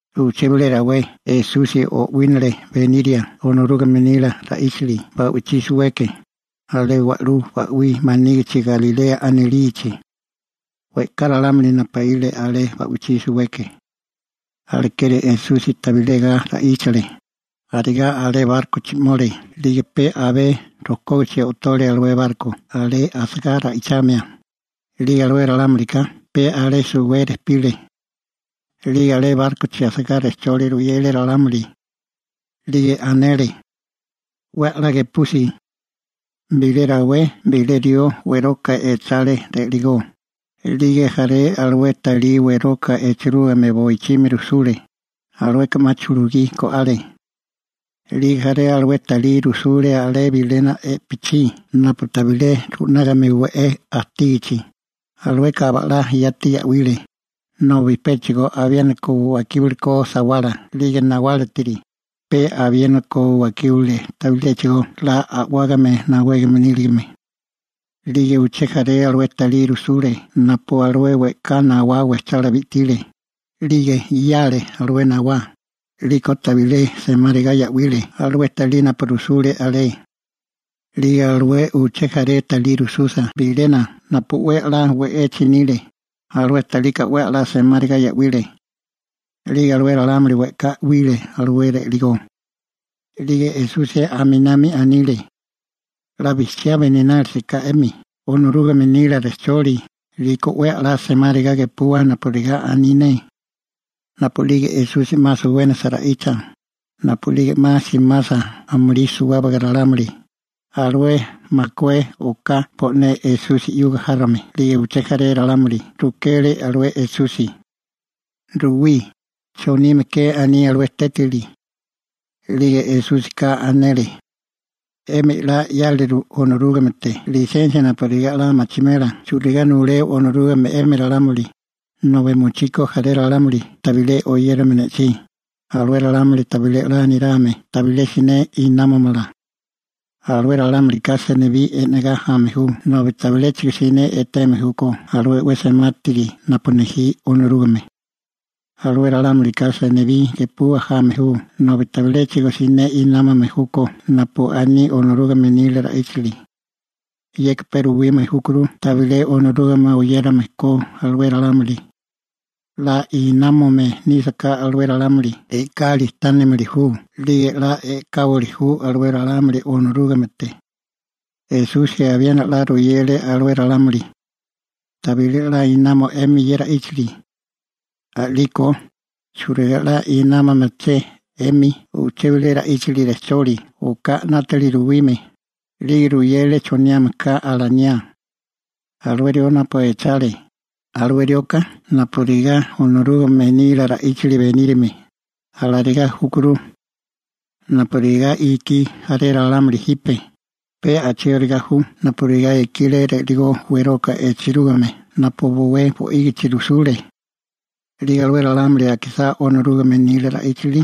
Uché bilé rawé Esusi o'wínale beniria Onorúgame nila ra'íchili ba'wichí suweke, alé wa'lú ba'wí manígichi Galilea anilichi. We'ká ralámuli napaíle alé ba'wichí suweke. Alekeri Esusi tabilé ga ra'íchale, arigá alé bárkochi 'mole 'lige pe abé rokógichi o'tole alué barko alé asagá ra'ichamia, 'lige alué ralámulika pe alé suwé rejpile. 'Lige alé bárkochi asagá rejcholi ruyele ralámuli. 'Lige anele: ―'We a'lá gepusi. Bilé rawé bilé rió weroka echale ri'ligó, 'lige jaré alué talí weroka echerúgime boichimi rujsule, alueka 'ma chulugí go'ale. 'Lige jaré alué talí rujsule alé bilena i'pichí napu tabilé ru'nágame we'é ajtígichi, alueka aba'lá yati ya'wile, nobi péchigo abiéniko wakíbale ko sawala 'lige nawálatiri, pe abiéniko wakíbale tabiléchigo 'la a'wágame nawégame níligame. 'Lige uché jaré alué talí rujsule napu alué we'ká nawala wejchá bi'tile, 'lige 'yale alué nawá, 'liko tabilé 'la semáriga ya'wile alué talí napu rujsule alé. 'Lige alué uché jaré alué talí rujsusa bilena napu 'we a'lá we'echi nile, alué talika 'we a'lá semáriga ya'wile. 'Lige alué ralámuli we'ká 'wile alué ri'ligó. 'Lige Esusi aminami anile: ―'La bijchiá beninálisaká 'emi Onorúgame nila rejcholi, 'liko 'we a'lá semáriga gepuwa napurigá aní ne. Napu'lige Esusi 'ma suwénasa ra'icha, napu'lige 'ma simasa amulí suwábaga ralámuli, alué makué oká bo'né Esusi 'yuga járome 'lige uché jaré ralámuli rukele alué Esusi: ―Ruwí, ¿chonime ke aní alué tétili? A'lige Esúsika anele: ―'Emi 'la 'yáleru Onorúgamete lisensia napurigá 'la machimela churigá nuleo Onorúgame 'emi ralámuli, nobi mochí ko jaré ralámuli tabilé oyérame ne'chí, alué ralámuli tabilé 'la nirame, tabilé siné námamala. Alué ralámulika senibí e'negá jame ju nobi tabiléchigo siné eteme júkó alué 'we semátiri napu nejí Onorúgame. Alué ralámulika senibí gepua jame ju nobi tabiléchigo siné námame júkó napu aní Onorúgame nila ra'íchili. Yeka pe ruwime júkuru tabilé Onorúgame oyérame ko alué ralámuli. 'La námame nísaká alué ralámuli e'kali tánimili ju 'lige 'la e'káwili ju alué ralámuli Onorúgamete. Esusi abiena 'la ruyele alué ralámuli: ―¿Tabilé 'la nama 'emi ye ra'íchili? A'liko ¿churigá 'la inámamaché 'emi uché bilé ra'íchili rejcholi oká 'nátili ruwime? 'Lige ruyele choniame ka alaniá: ―Alué rió napu echale, alué rioka napurigá Onorúgame nila ra'íchili beníriame, alarigá júkuru. Napurigá ikí jaré ralámuli jipe, pe a'chigóriga ju napurigá ikile ri'ligó weroka echerúgime napu bowé bo'ígichi rujsule. 'Lige alué ralámuli akisá Onorúgame nila ra'íchili,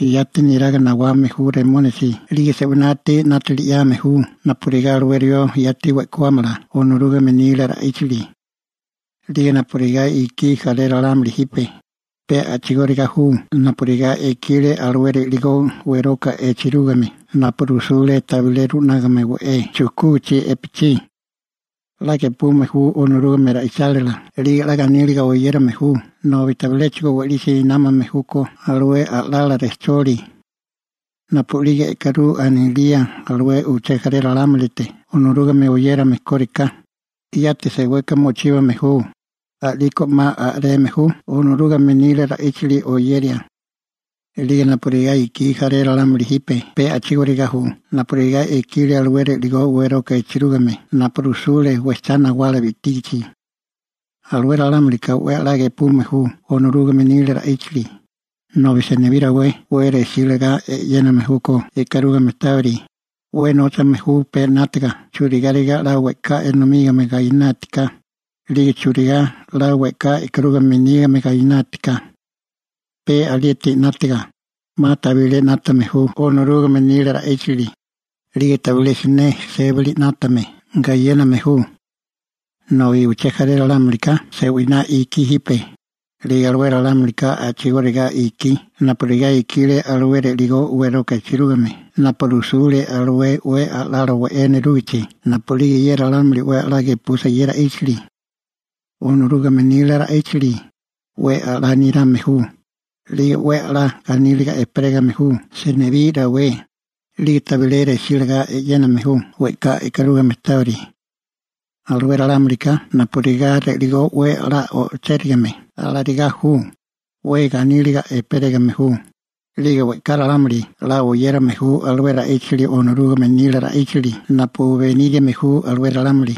yati neraga nawame ju Satanasi 'lige se'winátiri 'nátili 'yame ju napurigá alué rió yati we'kuámala Onorúgame nila ra'íchili. 'Lige napurigá ikí jaré ralámuli jipe, pe a'chigóriga ju napurigá ikile alué ri'ligó weroka echerúgime napu rujsule tabilé ru'nágame we'é chujkúgichi i'pichí. 'La gepume ju Onorúgame ra'ichálila 'lige 'la ganíliga oyérame ju nobi tabiléchigo we'lisi námame júkó alué a'lala rejcholi. Napu'lige e'karú anilía uché jaré ralámulite Onorúgame oyérame kóriká, yati seweka mochíbame ju, a'liko 'ma a'reme ju Onorúgame nila ra'íchili oyeria. 'Lige napurigá ikí jaré ralámuli jipe pe a'chigóriga ju napurigá ikile alué ri'ligó weroka echerúgime napu rujsule wejchá nawala bi'tígichi. Alué ralámulika 'we a'lá gepume ju Onorúgame nila ra'íchili, nobi senibí rawé 'we resí lagá e'yéname júkó e'karúgame tábiri, 'we nóchame ju pe 'nátaga churigáriga 'la we'ká enomígame gainátiká, 'lige churigá 'la we'ká e'karúgame nígame ganátiká. Pe alieti 'nátaga, 'ma tabilé 'nátame ju Onorúgame nila ra'íchili, 'lige tabilé siné sébili 'nátame gayéname ju. Nobi uché jaré ralámulika se'winá ikí jipe, 'lige alué ralámulika a'chigóriga ikí napurigá ikile alué ri'ligó weroka echerúgime napu rujsule alué 'we a'lala we'é nerúgichi. Napu'lige ye ralámuli 'we 'la gepusa ye ra'íchili Onorúgame nila ra'íchili, 'we a'lá nirame ju, 'lige 'we a'lá ganíliga ejperégame ju senibí rawé, 'lige tabilé resílagá e'yéname ju we'ká e'karúgame tábiri. Alué ralámulika napurigá ri'ligó 'we a'lá o'chérigame, alarigá ju, 'we ganíliga ejperégame ju. 'Lige we'ká ralámuli 'la oyérame ju alué ra'íchili Onorúgame nila ra'íchili napu beníriame ju alué ralámuli.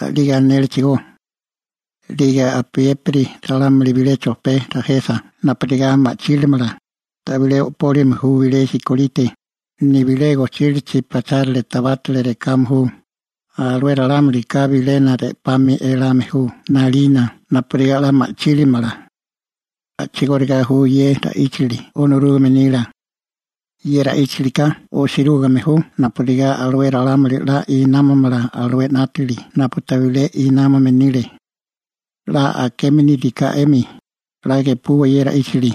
A'lige anélechigó: ―'Lige apiépiri ralámuli bilé chojpé rajesa napurigá 'la ma'chílimala, tabilé o'pólime ju bilé sikolite, nibilé gojchílachi pachárale tabátale rekame ju, alué ralámulika bilena re'pami elame ju 'nalina napurigá 'la ma'chílimala. A'chigóriga júchigó ye ra'íchili Onorúgame nila. Ye ra'íchilika osirúgime ju napurigá alué ralámuli 'la inámomala alué 'nátili napu tabilé inámome nile. › 'La akeme níriká 'emi, 'la gepuwa ye ra'íchili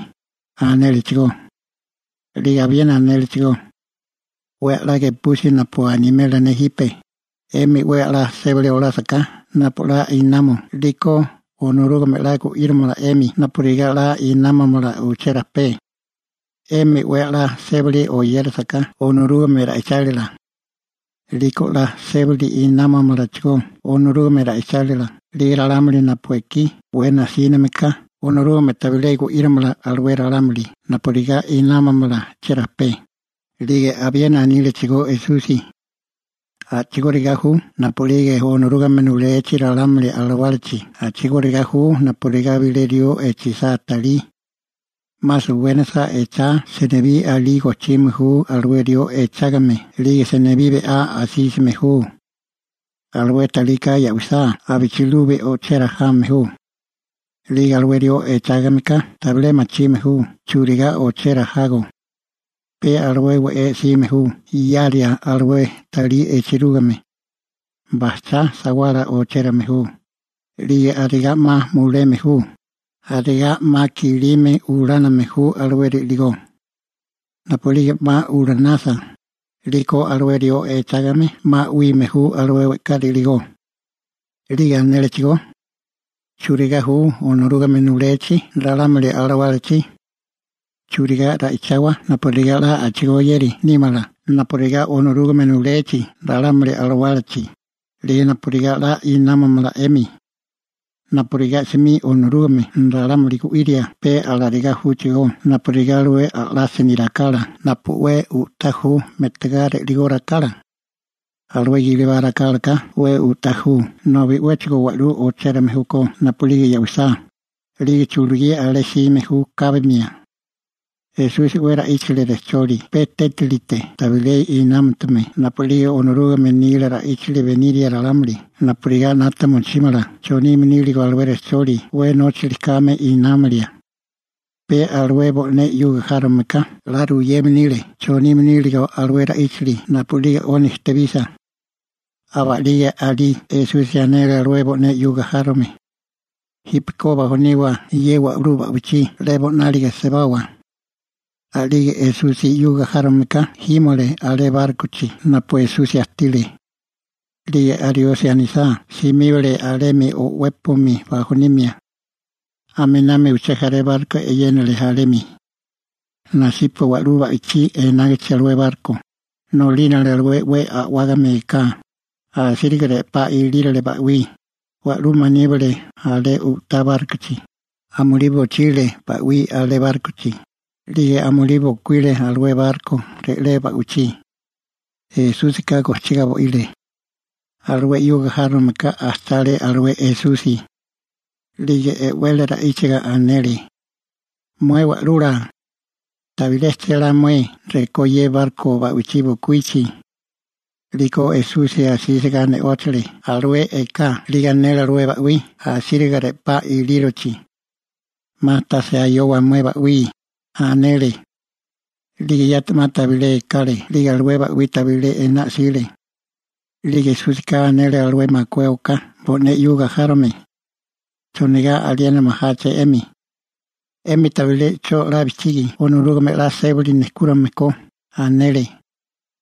―anélechigó. 'Lige abiena anélechigó: ―'We a'lá gepusi napu animela ne jipe, 'émi 'we a'lá sébali olásaká napu 'la namo 'liko Onorúgame 'la gu'írimala 'emi napurigá 'la inámomala uché rajpé. 'Emi 'we a'lá sébali oyérasaká Onorúgame ra'ichálila 'liko 'la sébali inámomalachigó Onorúgame ra'ichálila. 'Lige ralámuli napu ekí 'we najsíname ka, Onorúgame tabilé gu'íromala alué ralámuli napurigá námamala cherajpé. 'Lige abiena anílechigó Esusi: ―A'chigóriga ju napu'lige Onorúgame nulechi ralámuli alawálachi a'chigóriga ju napurigá bilé rió echisá talí. 'Ma suwénasa echá, senibí alí gojchime ju alué rió echágame 'lige senibí be'á asísime ju. Alué talika ya'wisá abichilubi o'chera jame ju. 'Lige alué rió echágameká tabilé machime ju churigá o'chera jago. Pe alué we'é 'sime ju yaria alué talí echerúgime. Bajchá sawala ochérame ju, 'lige arigá 'ma muleme ju, arigá 'ma kilimi uláname ju alué ri'ligó. Napu'lige 'ma ulánasa, 'liko alué rió echágame 'ma 'wime ju alué we'ká ri'ligó. 'Lige anélechigó: ―¿Churigá ju Onorúgame nulechi ralámuli alawálachi? ¿Churigá ra'ichawa napurigá 'la a'chigóyéri nímala napurigá Onorúgame nulechi ralámuli alawálachi, 'lige napurigá 'la inámomala 'emi? Napurigá 'smi Onorúgame ralámuli gu'iria, pe alarigá júchigó napurigá alué a'lásini rakala napu 'we u'tá ju me'tagá ri'ligó rakala. Alué gilibá rakálaka 'we u'tá ju nobi 'wéchigo wa'lú ochérame júkó napu'lige ya'wisá, 'lige chulugí alé jsime ju kábimia. Esusi 'we ra'íchale rejcholi pe tétalite tabilé inámutume napu'lige Onorúgame nila ra'íchili beniria ralámuli napurigá 'nata mochímala chonime níligo alué rejcholi 'we nóchili kame inámalia. Pe alué bo'né 'yuga járomeka 'la ruyeme nile chonime níligo alué ra'íchili napu'lige 'oni ejtebisa. Aba'lige alí Esusi anele alué bo'né 'yuga járome: ―Jípeko bajoniwa ye wa'lú ba'wichí 'lebo 'nálige sebawa. A'lige Esusi 'yuga járome ka jímole alé bárkochi napu Esusi ajtile. 'Lige ariosi anisá, simíbale alemi o'wépomi bajonimia. Aminami uché jaré barko e'yénale alemi. Nasipa wa'lú ba'wichí enágichi alué barko, nolínale alué 'we a'wágame eká, asíriga re'pá ilírole ba'wí, wa'lú maníbale alé u'tá bárkochi, amulí bochile ba'wí alé bárkochi, 'lige amulí bokuíle alué barko re'lé ba'wichí. Esúsika gojchigá bo'ile. Alué 'yuga járomeka ajchale alué Esusi. 'Lige e'wele ra'íchiga anele: ―¡Mué Wa'lula! ¿Tabilé chélá mué rekó ye barko ba'wichí bokuíchi? 'Liko Esusi asísiga ne'óchale alué eká 'lige anele alué ba'wí asíriga re'pá ilírochi: ―¡'Ma tase ayowa mué ba'wí! ―anele. 'Lige yati 'ma tabilé ekale 'lige alué ba'wí tabilé ená 'sile. A'lige Esúsika anele alué makué oká bo'né 'yuga járome: ―¿Chonigá aliena majáché 'emi? ¿'Emi tabilé 'cho 'la bijchigi Onorúgame 'la sébali nejkúrame ko? ―anele.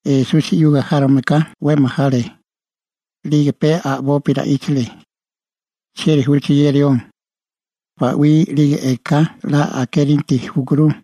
Esusi 'yuga járomeka 'we majale. 'Lige pe a'bopi ra'íchale: ―¿Chieri júché ye rió? ¡Ba'wí 'lige eká 'la akérinti júkuru!